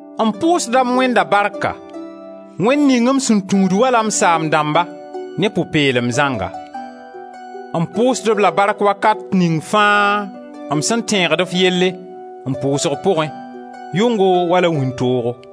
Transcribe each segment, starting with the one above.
M pʋʋsda m Wẽnda barka, Wẽnd ning m sẽn tũud wala m saam-dãmba, ne pʋ-peelem zãnga. M pʋʋsd-b la barka wakat ning fãa m sẽn tẽegd f yelle, m pʋʋsg pʋgẽ, yʋngo wala wĩntoogo.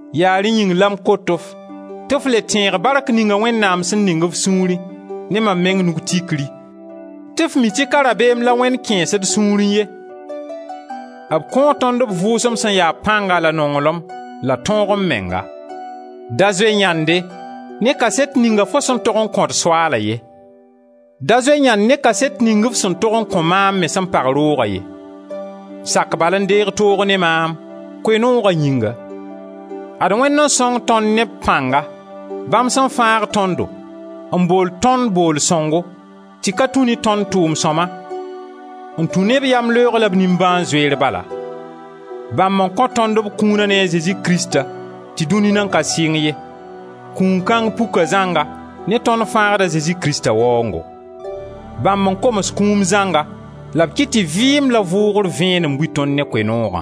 Yaa rẽ yĩng la m kot-f tɩ f le tẽeg bark ninga Wẽnnaam sẽn ning f sũurẽ ne mam meng nug tikri, tɩ f mi tɩ ka rabeem la Wẽnd kẽes d sũurẽ ye, b kõo tõnd b Vʋʋsem sẽn ya pãnga la nonglem la tõog-m-menga. Da zoe yãnde ne kaset ninga fo sẽn tog n kõ d Soaala ye; da zoe yãnd ne kaset ning f sẽn tog n kõ maam me sẽn pag roog a ye; sak bal n deeg toog ne maam, Koe-nooga yĩnga. Ad Wẽnd n sõng tõnd ne b pãnga, bãmb sẽn fãag tõndo n bool tõnd booll sõngo, tɩ ka tũ ne tõnd tʋʋm-sõma, n tũ ne b yamleoog la b nimbãan-zoeer bala. Bãmb n kõ tõnd b kũuna ne a Zezi Krista tɩ dũni nan ka sɩng ye. Kũun kãng puka zãnga ne tõnd Fãagd a Zezi Krista waoongo: bãmb n koms kũum zãnga la b kɩt tɩ vɩɩm la vʋʋgr vẽenem bui tõnd ne Koe-noogã.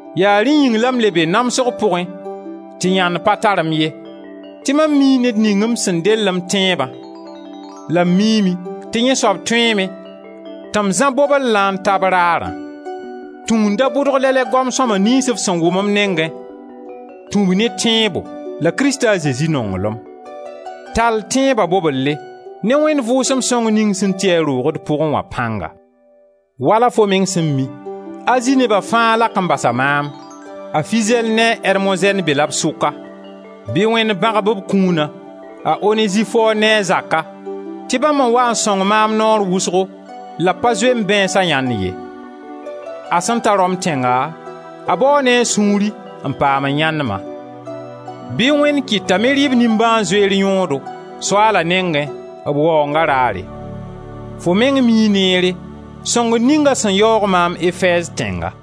Yaa rẽ yĩng la m le be namsg pʋgẽ tɩ yãnd pa tar-m ye, tɩ mam mii ned ning m sẽn dell m tẽebã la m miime tɩ yẽ soab tõeeme tɩ m zã bobellã n ta b Raarã. Tũ n da bʋdg lɛ-lɛ goam sõma niyns f sẽn wʋm m nengẽ, tũ-b ne tẽebo la Krista a Zezi nonglem. Tall tẽeba bobelle ne Wẽnd Vʋʋsem Sõng ning sẽn ti a roog d pʋgẽ wã pãnga. Wala fo meng sẽn mi, Azi neba fãa lak n basa maam; a Fizɛl ne a Ermozɛn be-la b sʋka. Bɩ Wẽnd bãgb b kũuna a Onezifor ne a zaka, tɩ bãmb n waa n sõng maam naoor wʋsgo la b pa zoe m bãeensa yãnd ye. A sẽn ta Rom tẽnga a bao ne a sũurẽ n paam n yãend-ma. Bɩ Wẽnd kɩt t'a me rɩ b nimbãan-zoeer yõodo, Soaala nengẽ, b waoonga raare. Fo meng mii neere sõngr ning a sẽn yaoog maam Efɛɛz tẽnga.